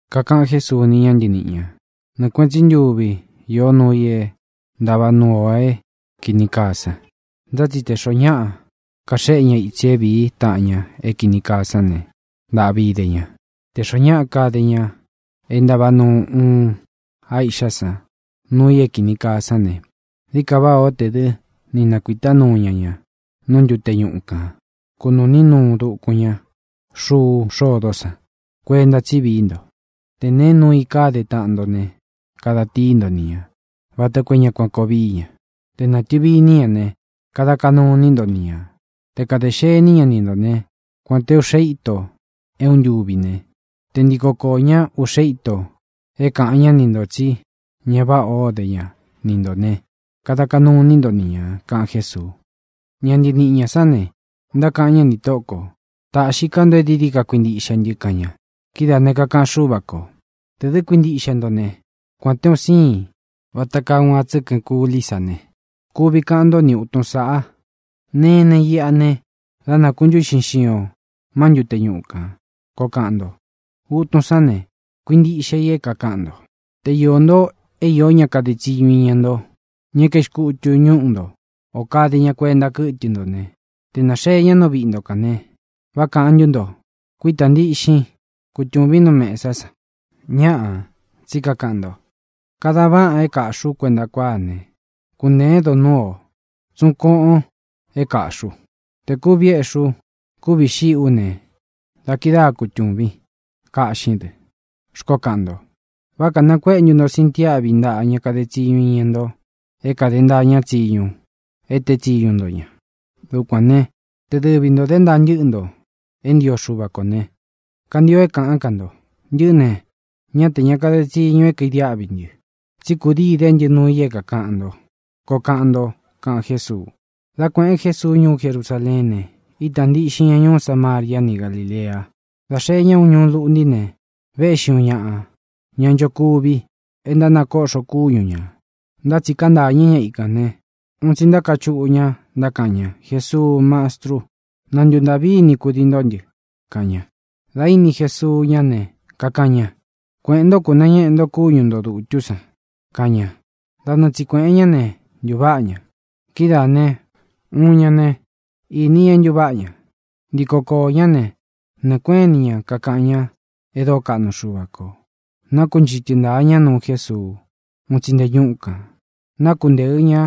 Kakaꞌan Jésuu ni ña ntɨníꞌi ñā: —Nɨɨ kuēꞌen tsí ntuvi īó nuu i é ntava nuu ō é kīni kaa san. Ntá tsi te xōo ñáꞌa kaxéꞌe ña itsi é vīí taꞌan ña é kīni kaa sán ne, ¡ntāꞌvi ide ña! Tē xoó ñaꞌa kade ña é ntava nuu uun á iꞌxá san nuu i é kīni kaa sán ne, dií ka váꞌā ó tē dɨ́ ni nakuīta núu ña ña nú ntute ñuꞌu kān, kunūꞌní nuu dukun ña xuu xódó san. Kuenta tsí vií nto. ʼTe nēe nuu i káde taꞌan nto ne, kada tíi nto ni ñā vata koo é ña kuan koo víi ña. Te nātɨvi iní ña ne, kada kaꞌnu iní nto ni ñā. Te kadē xení ña ni ntō né, kuān té uꞌxe íto é uun ntuvi ne, te ntiko koō ñá uꞌxe íto é kāꞌan ñá ni ntō tsí ña váꞌa o dé ña ni ntō ne, kada kaꞌnu iní nto ni ñā —kaꞌan Jésuu. Ña ntɨniꞌi ñā sán ne, ntákaꞌan ñá nī Tóꞌo kō: —Tāꞌxi ká nto e dií dií ka kuintiꞌxe ntɨ —kaꞌan ña. Kidáā ne, kakaꞌan Xúva kō: —Tē dɨ́ kuintiꞌxe nto ne, kuān té un síin vata kaa uun a tsɨ́kɨn kulí sa ne, kuvi kaꞌan ntó ni utun sāꞌa: “Nenen iꞌa ne, da nākuntúꞌxin xion má ntute ñuꞌu kān”, koo kaꞌan nto. Utun sán ne, kuintiꞌxe i é kākaꞌan nto. ʼTe iō nto é īó ña kade tsiñu iña nto, ña é kaixkutu ñúꞌu nto ō kade ña kuenta kɨ́tɨ nto ne, tē náxee ña nú viꞌi nto kān ne, ¿vá kākaꞌan ntú nto: “Kuítā ntíꞌxin, kutūvin nú mesá san”? Ñáꞌā, tsí kakaꞌan nto: “Kadan vaꞌān é kāꞌxi u kuenta kuáa ne, kuntēen donúu o, tsuꞌun kóꞌōn é kāꞌxi u. Tē kúvi éꞌxi ú, kúvi xíꞌi ú ne, dá kidáa kutūvín, kaꞌxín dɨ”, xkoó kaꞌan nto. ¿Vá kānakuéꞌe ntu nto sintiáꞌvi ntāꞌa ña kade tsiñu iña nto é kāde ntaa ñá tsiñu e teé tsiñu nto ña? Dukuān né, te dɨvi ntō dé ntaa ntɨ́ꞌɨ nto é ntio Xuva ko ne, kantio é kāꞌán ka nto: “Ntɨꞌɨ́ ne, ñá tē ña kade tsiñu é kaidiáꞌvi ntɨ, tsí kūdii idé ntɨ nuu i é kākaꞌan nto”, koo kaꞌan nto —kaꞌan Jésuu. Dā kueꞌen Jésuu ñuú Jerusaleén ne, ítā ntíꞌxin ña ñuú Samaria ni Gálilea. Dā xee ñá uun ñuu lúꞌnti ne, véꞌxi ūꞌxi ñáꞌa ña ntánchokuvi e ntánakoꞌxo kúñu ñā, ntá tsi kantáñɨ ikā ñá ne, un tsi ntákachuꞌu ña, ntákaꞌan ña: —¡Jesuu, Mastrú, na ntuntāꞌví ini kudii ntó ntɨ! —kaꞌan ña. Dā íni Jesuu ñá ne, kakaꞌan ña: —Kueꞌēn ntó, kūnañéꞌe nto kúñu nto dūtú san —kaꞌan ña. Da nɨɨ tsi kuēꞌen ñá ne, ntuváꞌa ña. Kidáā ne, uun ña ne, īní ña é ntuváꞌa ña. Ntiko koō ñá ne, nɨɨ̄ kuéꞌen ini ña kakaꞌan ña e dóo kaꞌnu Xuva kō. Nákunchɨtɨ ntāa ña nuu Jésuu. Un tsi nte ñúꞌu kān nakuntéɨ ña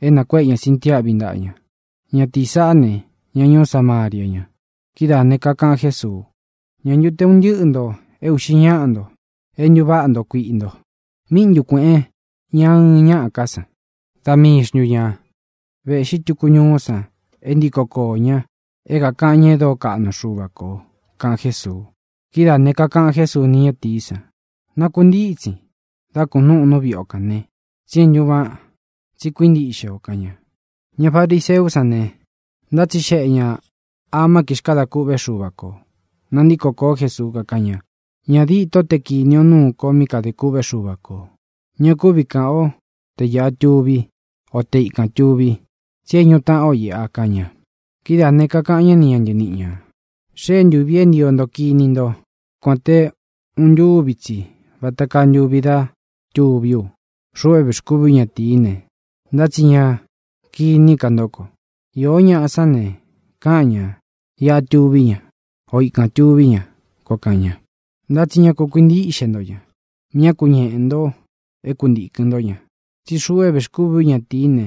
é nakuéꞌe ña sintiáꞌvi ntaꞌa ña. Ñatīí saꞌá ne, ña ñuú Samaria ña. Kidáā ne, kakaꞌan Jésuu: —¿Ñā ntu te un ntɨ́ꞌɨ nto é uꞌxi ñáꞌa nto e ntuváꞌa nto kuiꞌi nto? ¿Míꞌi ntu kuēꞌen ña ɨɨn ñáꞌa ká san? ¿Da mii xntu ñā véꞌxi tuku ñuú san e ntíko koō ña é kākaꞌan ña e dóo kaꞌnu Xuva kō? —kaꞌan Jésuu. Kidáā ne, kakaꞌan Jésuu ni ñátīí san: —Nakuntítsin, dā kunúꞌun nú viꞌi o kan vē, tsi é ntūváꞌan, tsi kuíntiꞌxe ō —kaꞌan ña. Ña fariseú san ne, ntátsixeꞌe ñā amá kixkadā kûꞌvé Xuva kō. Nantíko kōó Jesuu, kakáꞌan ña: —Ñā dîtó te kini o núu ko mí kadē kûꞌvé Xuva kō. Ña kúvi kāꞌan o te iꞌa túvi, o te ikān tuvi, tsi é ñūꞌu taꞌán o ī —kaꞌan ña. Kidáā ne, kakaꞌan ñá ni ña ntɨniꞌi ñā: —Xée ntūvi é ntio nto kini nto kuān te uun ntúvi tsi vata kaa ntuvi dá tuví u, xuꞌu é vēxkúvi ú ñatīí ne, ntá tsi ña kiní ka ntó ko. Iō ñáꞌa sán ne, káꞌan ñā: “Iꞌa tuví ña”, o “Ikān tuví ña”, koo kaꞌan ña; ntá tsi ña ku kuintíꞌxe nto ña; ñá ku ñeꞌē nto é kuntīkɨn ntó ña. Tsí xuꞌu é vēxkúvi ú ñatīí ne,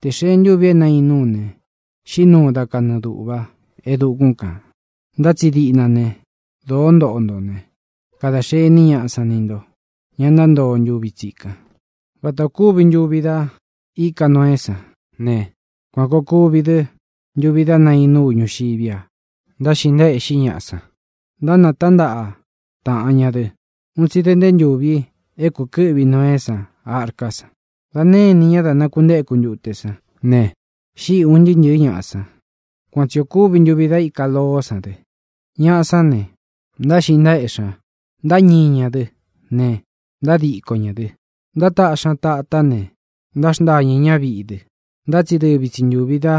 tē xee ntúvi é nainú u ne, xiꞌí nuu da kanɨɨ dūꞌva e dukún kān. Ntá tsi diꞌna ne, dōó ntoꞌo nto ne, kadā xení ñaꞌa san ni nto, ña ntántoo ntuvi tsikan. Vata ō kúvi ntuvi da íka Noeé san ne, kuan kōo kuvi dɨ́ ntuvi dá nainú u ñūxiví a. Ntáxiꞌi ntaéꞌxi ñaꞌa san, ntánatántaꞌa taꞌan ña dɨ, un tsi da nte ntúvī é kūkɨ́ꞌvi Noeé san arká san. Dā née inī ñá da nakuntéku ntute sán ne, xíꞌi ūn ntɨɨ́ ntɨ̄ɨ́ ñaꞌa san. Kuan tsi ō kúvi ntuvi da íka Loó san dɨ. Ñaꞌa sán ne, ntáxiꞌi ntaéꞌxi ña, ntáñii ña dɨ́ ne, ntádiko ñā dɨ. Ntátaꞌxi ña tatá ne, ntáxntañɨ̄ ñá viꞌi dɨ. Ntá tsi dɨvi tsi ntūvi da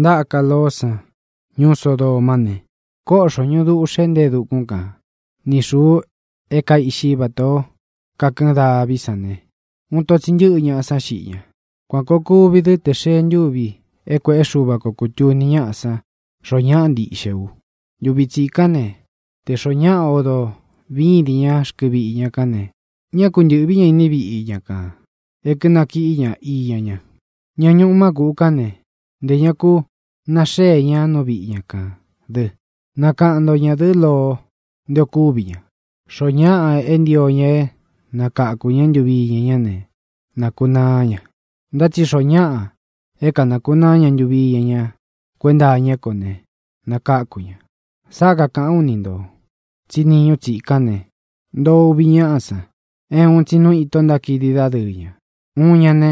ntáka Loó san ñuú Sodoma ne, kóꞌxo ñūꞌu dúꞌxē nte e dukún kan, ni xūu é kaiꞌxi vatā ó kakɨɨn daví san ne, uun ito tsi ntɨ́ꞌɨ ñaꞌa sán xiꞌi ña. Kuan kōo kuvi dɨ́ tē xee ntúvi é kuēꞌé Xuva ko kūtuni ñáꞌa san xoo ñáꞌa ntiꞌxe u. ʼNtuvi tsikán ne, tē xoó ñaꞌa odo vídin ña rkɨ viꞌi ña kán ne, ñá ku ntɨ̄ꞌví ña iní viꞌi ña kān é kɨ̄nakiꞌí ña iña ña. Ña ñuꞌu má kūꞌu kán ne, ntē ña ku naxée ña nú viꞌi ña kān dɨ. Nakaꞌan nto ñadɨ̄ꞌɨ́ Loo nté ō kúvi ña. Xoó ñaꞌa é ntio ña é nakakū ñá ntuvi iña ñá ne, nakunaá ña. Ntá tsi xoo ñáꞌa é kanakunaá ña ntuvi iña ña kuenta iñá ko ne, nakáku ña. ʼSáꞌa kakāꞌán u ni ntō tsí niñu tsikan ne, ntoo uvi ñáꞌa san, é uun tsi nu ito ntákidi dádɨɨ ña. Uun ña ne,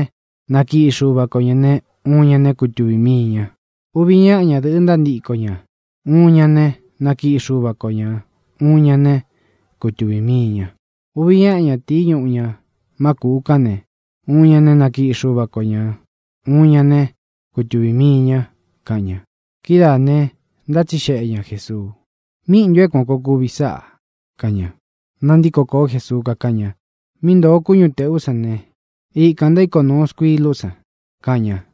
nakiꞌi Xuva ko ñā ne, uun ña ne, kutuvī mii ña. Uvi ñáꞌa ñadɨ̄ꞌɨ ntántiko ña. Uun ña ne, nakiꞌi Xuva ko ñā; uun ña ne, kutuvī mii ña. Uvi ñáꞌa ñatīí ñuꞌu ña má kūꞌu kán ne, uun ñaꞌa ñā né, nakiꞌi Xuva ko ñā; uun ñaꞌa ñā né, kutuvī mii ña —kaꞌan ña. Kidáā ne, ntátsixeꞌe ña Jēsuu: —¿Míꞌi ntū é kuān koo kuvi sáꞌā? —kaꞌan ña. Nántiko kōó Jesuu, kakáꞌan ña: —Mí ntōo kúñu tēꞌú san ne, ikān ntaíko nūu skuilú san —kaꞌan ña.